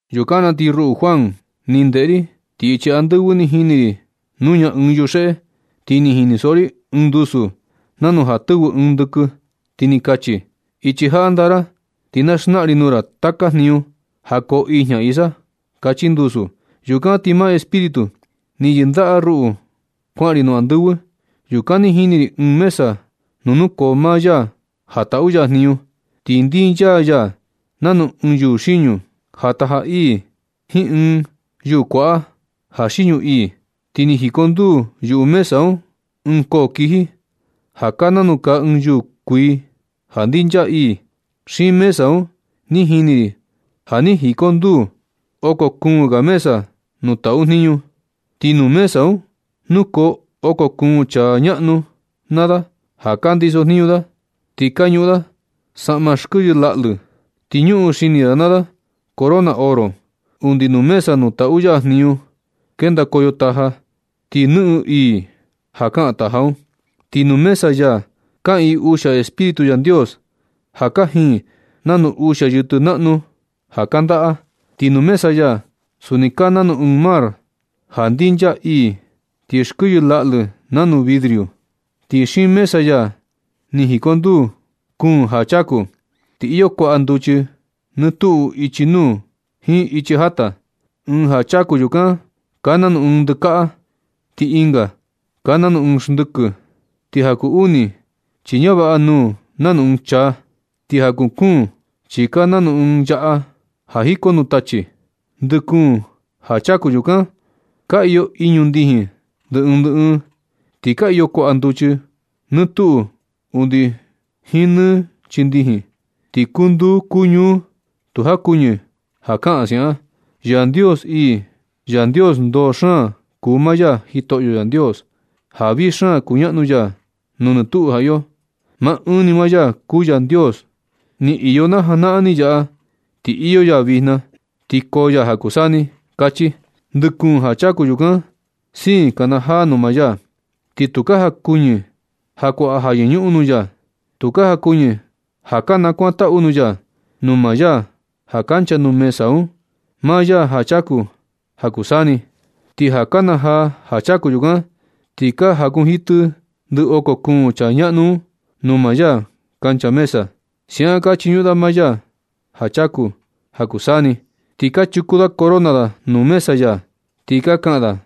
Yukan na ti ruꞌu Juan, ni ndeꞌe ri, ti ichi andɨvɨ ni jini ri nuña ɨɨn yuxeꞌe. Ti ni jinisoꞌo ri ɨɨn ndusu nanu ja tɨvɨ ɨɨn ndɨkɨ, ti ni kachi: ―Ichi jaꞌa ndaa ra, ti na xnaꞌan ri nuu ra taka jniñu ja koo ijña isa ―kachi ndusu. Yukan ni maa Espíritu ni yɨndaꞌa ya ruꞌu kuaꞌan ri nuu andɨvɨ. Yukan ni jini ri ɨɨn mesa nuu nukoo maa ya ja taꞌu ya jniñu. Ti ndinchaa ya nanu ɨɨn yuu xiñu ja taja ii jiin ɨɨn yuu kuaꞌa ja xiñu ii. Ti ni jikonduu yuꞌu mesa un ɨɨn koo kiji, ja kaa nanu kaa ɨɨn yuu kuii ja ndinchaa ii. Xiin mesa un ni jini ri ja ni jikonduu oko kuun ga mesa nuu taꞌu jniñu. Ti nuu mesa un nukoo oko kuun chaa ñaꞌnu naa da ja ka ndiso jniñu da. Ti ka ñuꞌun da saꞌma skɨyɨ laꞌlɨ. Ti ñuꞌun xini da naa da corona oro. Undi nuu mesa nuu taꞌu ya jniñu kendakoyo taja, ti nɨꞌɨn ii ja kaꞌan taja un. Ti nuu mesa ya kaꞌiin uxia Espíritu Yandios ja kajin nanu uxia yɨtɨ naꞌnu ja kandaꞌa. Ti nuu mesa ya suni kaa nanu ɨɨn mar ja ndinchaa ii ti skɨyɨ laꞌlɨ nanu vidrio. Ti xiin mesa ya ni jikonduu kuun ja chaku. Ti iyo kuaꞌa nduchi nɨ tuꞌu ichi nuu jiin ichi jata. Ɨɨn ja chaku yukan kaa nanu ɨɨn ndɨkaꞌa. Ti ɨnga kaa nanu ɨɨn xndɨkɨ. Ti ja kuu uni chi ñavaꞌa nuu nanu ɨɨn chaa. Ti ja kuu kuun chi kaa nanu ɨɨn yaꞌa ja jiko nuu tachi. Ndɨ kuun ja chaku yukan ka iyo iñu ndijin ndɨ ɨɨn ndɨ ɨɨn. Ti ka iyo kuaꞌa nduchi nɨ tuꞌu undi jiin nɨ chii ndijin. Ti kuu nduu kuu ñuu tu jakuɨñɨ ja kaꞌan siaꞌan: Yandios ii, Yandios ndoo xaan kuu maa Jitoꞌo Yandios, ja vii xaan kuñaꞌnu ya nuu nɨ tuꞌu ja iyo. Maa ɨɨn ni maa ya kuu Yandios ni iyo na janaꞌan ni yaꞌa, ti iyo ya vijna, ti koo ya ja kuu saa ni ―kachi. Ndɨ kuun ja chaku yukan siin ka kanajaa nuu maa ya. Ti tu ka jakuɨñɨ ja kuaꞌa ja yɨñuꞌun nuu ya. Tu ka jakuɨñɨ ja ka nakuantaꞌu nuu ya, nuu maa ya ja kancha nuu mesa un, maa ya ja chaku ja kuu taka saa ni. Ti ja kanajaa ja chaku yukan, ti ka jakunjitɨ ndɨ oko kuun chaa ñaꞌnu un nuu maa ya kancha mesa. Siaꞌan ka chiñuꞌun da maa ya ja chaku ja kuu saa ni. Ti ka chuku da corona da nuu mesa ya, ti ka kaꞌan da: